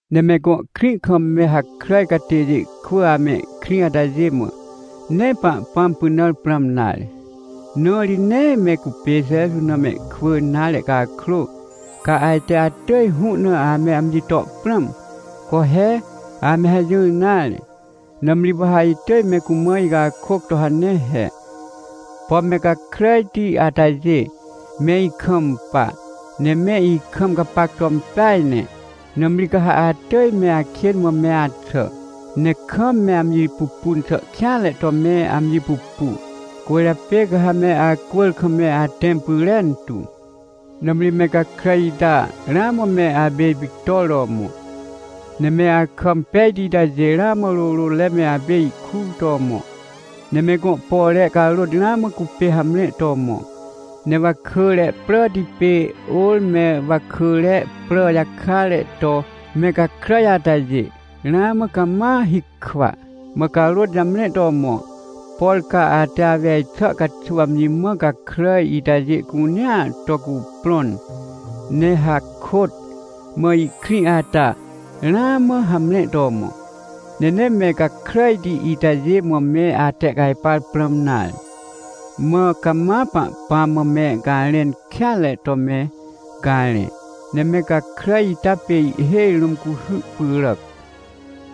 Ne me gõ krĩ kam me hakràj catêjê kwỳ amehkrĩ atajê mã, nee Pahpãm pynãr prãm nare, na ri nee me cupê Jeju na mehkwỳ nare cakrô, ca ajte atỳj hũ na ame amji to prãm. Co he, ame hajỹr nare! Nãmri wa ha itỳj me cumã icakôc to hane he: — Pom me gakràjti atajê, me ikampa, ne me ikam gapac to impeaj ne. Nãmri ca ha atỳj me akên mã me axà, ne kam me amji pupun xà kêanre to me amji pupu, cwỳrjapê ca ha me acwỳr kam me atẽm pyrentu. Nãmri me gakràj ita ramã me apê ipictor to mõ, ne me akà impejti itajê ramã rôrôtre me apê ihkur to mõ. Ne me gõ pore carôt ramã cupê hamre to mõ. Ne wakỳre pràti pê ôr me wakỳre prà jakare to me gakràj atajê, ramã cama hikwa, mã carôt jamre to mõ. Por ca ate awej xà caxuw amji mã gakràj itajê cunea to cuprõn, ne hakôt mã ihkrĩ ata, ramã hamre to mõ. Ne nee me gakràjti itajê mã me atehcajpar prãm nare, mã cama Pahpãm mã me garẽn kêanre to me garẽ. Ne me gakràj ita pê ihhêj rũm cuhy pyràac,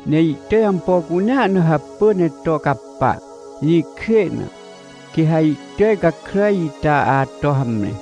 ne ihtỳj ampo cunea na hapỳ ne to capa. Jĩkjê na, quê ha ihtỳj gakràj ita ato hamre.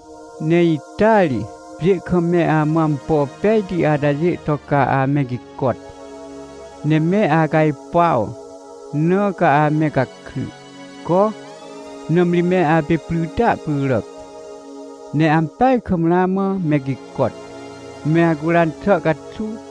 — Ne ita ri, pjê kam me amã ampo pejti atajê to ca ame gicot, ne me acajpuaw, na ca ame gakry. Co, nãmri me apê prytia pyràc, ne ampeaj kam ramã me gicot, me acuran xà caxuw!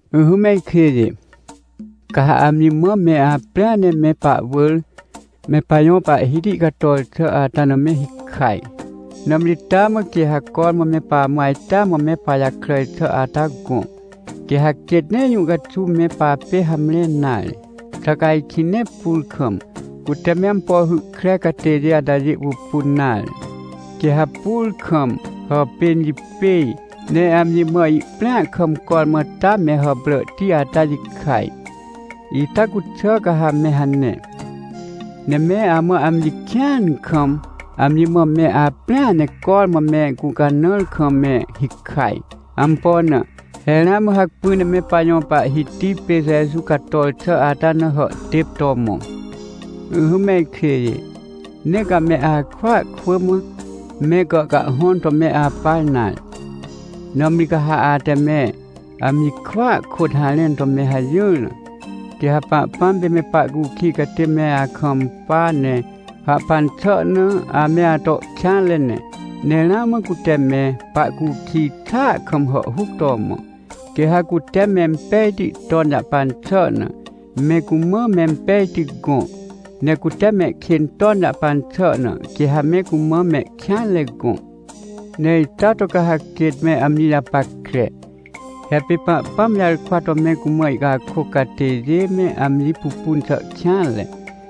Ỹhỹ me ikjêjê, ca ha amji mã me aprĩa ne me pahwỳr me pajõ Pahhiti cator xà ata na me hikaj. Nãmri taa mã quê ha cormã me pamã ajtea mã me pajakràj xà ata gõ, quê ha quêt nee jũ caxuw me papê hamre nare. Xà ca ajkĩ nee pur kam, cute me ampo hy kre catêjê atajê pupun nare? Quê ha pur kam hàpên jipêj, ne amji mã ihprĩa kam cormã ta me hàpràhti ata jikaj. Ita cuxà ca ha me hane, ne me amã amji kĩan kam, amji mã me aprĩa ne cormã me gũcanãar kam me hikaj. Ampo na? He ramã hacpỹ ne me pajõ Pahhiti pê Jeju cator xà ata na hàhtêp to mõ. Ỹhỹ me ikjêjê, nee ca me akwỳa kwỳ mã, me gàhcahhõn to me apa nare. Nãmri ca ha ate me amji kwỳa kôt harẽn to me hajỹr na, quê ha Pahpãm pê me pahcukij catê me akampa, ne hahpan xà na ame ato kêanre ne. Ne ramã cute me pahcukij xàa kam hàhhuc to mõ. Quê ha cute mempejti ton jahpan xà na, me cumã mempejti gõ, ne cute mehkên ton jahpan xà na, quê ha me cumã mehkêanre gõ. Ne ita to ca ha quêt me amji japackre. He pê Pahpãm jarkwa to me cumã ihcakôc catêjê me amji pupun xà kêanre,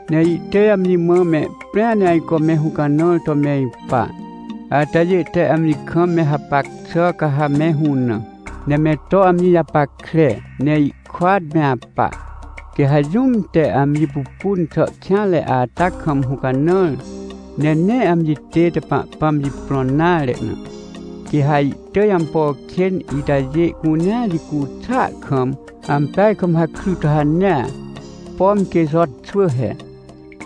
ne ihtỳj amji mã mehprĩa ne ajco me hũcanãr to me ipa. Atajê te amji kam me hapac xà ca ha me hũnã, ne me to amji japackre ne ihkôat me apa. Quê ha jũm te amji pupun xà kêanre ata kam hũcanãr, ne nee amji tête Pahpãm jiprõn nare na, quê ha ihtỳj ampo kên itajê cunea jicu xàa kam ampeaj kam hakry to hanea, pom quê Jo xwỳ he.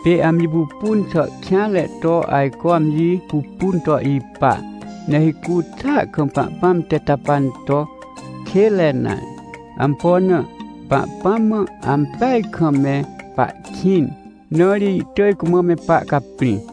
Pê amji pupun xà kêanre to ajco amji pupun to ipa, ne hicu xàa kam Pahpãm te to hàhpan to kênre nare. Ampo na? Pahpãm mã ampeaj kam me pahkĩn, na ri ihtỳj cumã me pahcaprĩ.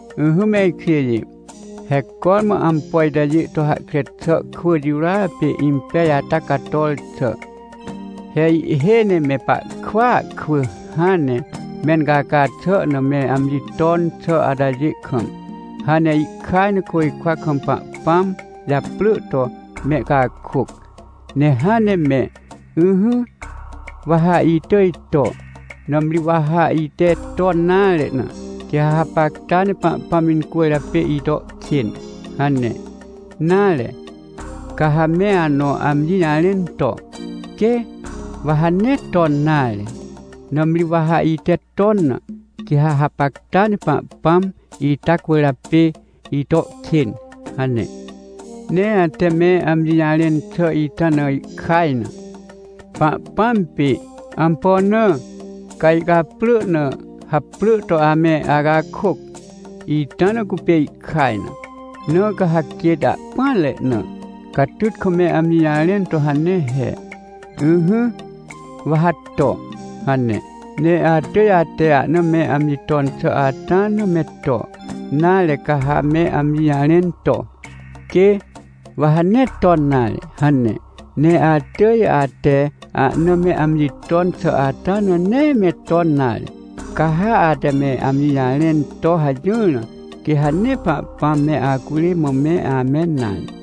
Ỹhỹ me ikjêjê, he cormã ampo itajê to hahkre xà kwỳ jirôa pê impej ata cator xà. He ihhêj ne me pahkwỳa kwỳ hãn ne mencaca xà na me amji ton xà atajê kam, hãn ne ihkaj na côjkwa kam Pahpãm japrỳ to mehcakôc ne hãn ne me: — Ỹhỹ, wa ha itỳj to, nãmri wa ha ite ton nare na, quê ha hapacta ne Pahpãm incwỳrjapê ito kên — hane, nare, ca ha me anõ amji jarẽn to: — Quê, wa ha nee ton nare, nãmri wa ha ite ton na, quê ha hapacta ne Pahpãm ita cwỳrjapê ito kên — hane. Ne ate me amji jarẽn xà ita na ihkaj na, Pahpãm pê. Ampo na? Ca ihcaprỳ na haprỳ to ame acakôc, ita na cupê ihkaj na. Na ca ha quêt ahpỹanre na catyt kam me amji jarẽn to hane he: — Ỹhỹ, wa ha to — hane, ne atỳj ate ahna me amji ton xà ata na me to. Nare, ca ha me amji jarẽn to: — Quê, wa ha nee ton nare — hane, ne atỳj ate ahna me amji ton xà ata na nee me ton nare. Ca ha ate me amji jarẽn to hajỹr na, quê ha nee Pahpãm me acurê mã me amẽn nare.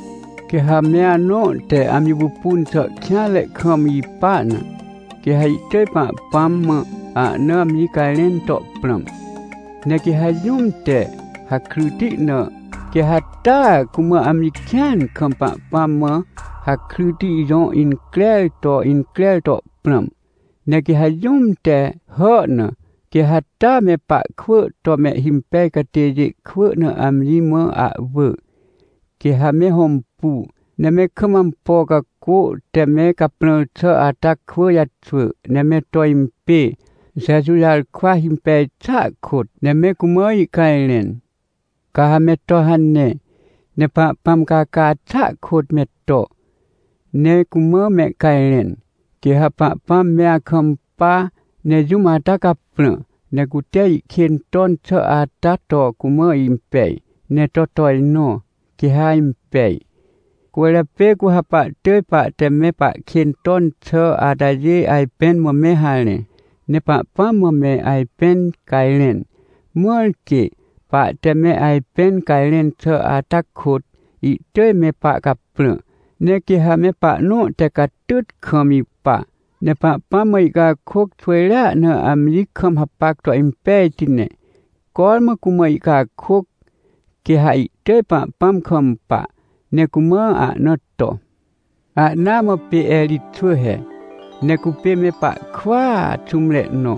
Quê ha me anõ te amji pupun xà kêanre kam ipa na, quê ha ihtỳj Pahpãm mã ahna amji cajrẽn to prãm. Ne quê ha jũm te hakryti na, quê ha taa cumã amji kĩan kam Pahpãm mã hakryti jõ increr to increr to prãm. Ne quê ha jũm te hà na, quê ha taa me pahkwỳ to mehhimpej catêjê kwỳ na amji mã ahwỳ, quê ha me hõmpu, ne me kam ampo cacô te me caprãr xà ata kwỳ jaxwỳ, ne me to impê, Jeju jarkwa himpej xàa kôt, ne me cumã ihcajrẽn. Ca ha me to hanea ne Pahpãm caca xàa kôt me to ne cumã mehcajrẽn, quê ha Pahpãm me akampa ne jũm ata caprã. Ne cute ihkên ton xà ata to cumã impej, ne to tojnõ, quê ha impej. Cwỳrjapê cu ha pahtỳj pahte me pahkên ton xà atajê ajpẽn mã me harẽ, ne Pahpãm mã me ajpẽn cajrẽn, mãr quê pahte me ajpẽn cajrẽn xà ata kôt, ihtỳj me pahcaprã. Ne quê ha me pahnõ te catyt kam ipa, ne Pahpãm mã ihcakôc xwỳjrea na amji kam hapac to impejti, ne cormã cumã ihcakôc, quê ha ihtỳj Pahpãm kampa, ne cumã ahna to. Ahnaa mã pê Erij xwỳ he. Ne cupê me pahkwỳa xũmre nõ,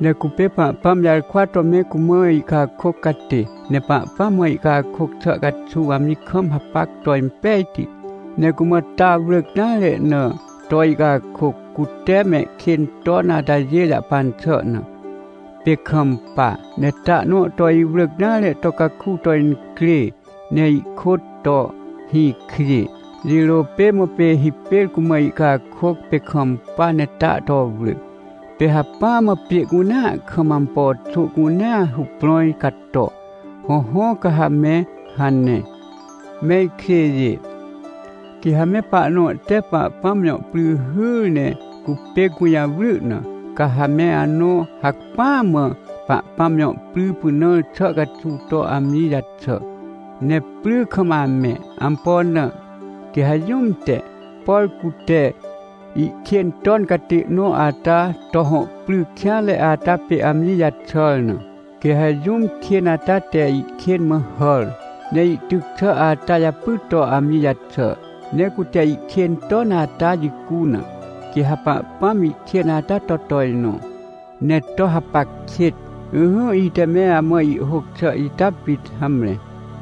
ne cupê Pahpãm jarkwa to me cumã ihcakôc catê. Ne Pahpãm mã ihcakôc xà caxuw amji kam hapac to impejti, ne cumã ta wrỳc nare na to ihcakôc, cute mehkên ton atajê jahpan xà na, pê kampa, ne ta nõ to iwrỳc nare to caku to incrê ne ihkôt to hĩkjê. Jirô pê mã pê hipêr cumã ihcakôc, pê kampa ne ta to wrỳ, pê hacpỹa mã pjê cunea kam ampo xô cunea huprãj cato. Hõhõ, ca ha me hane. Me ikjêjê, quê ha me pahnõ te Pahpãm jõ pry hyr ne cupê gũjawry na, ca ha me anõ hacpỹa mã Pahpãm jõ pry pynãr xà caxuw to amji jaxà, ne pry kam amẽ. Ampo na? Quê ha jũm te, por cute ihkên ton catê nõ ata to hõ pry kêanre ata pê amji jaxàr na, quê ha jũm kên ata te ihkên mã hàr, ne ihtyc xà ata japy to amji jaxà, ne cute ihkên ton ata jicu na, quê ha Pahpãm ihkên ata to tojnõ, ne to hapac kêt. Ỹhỹ, ite me amã ihhôc xà ita pit. Hamre.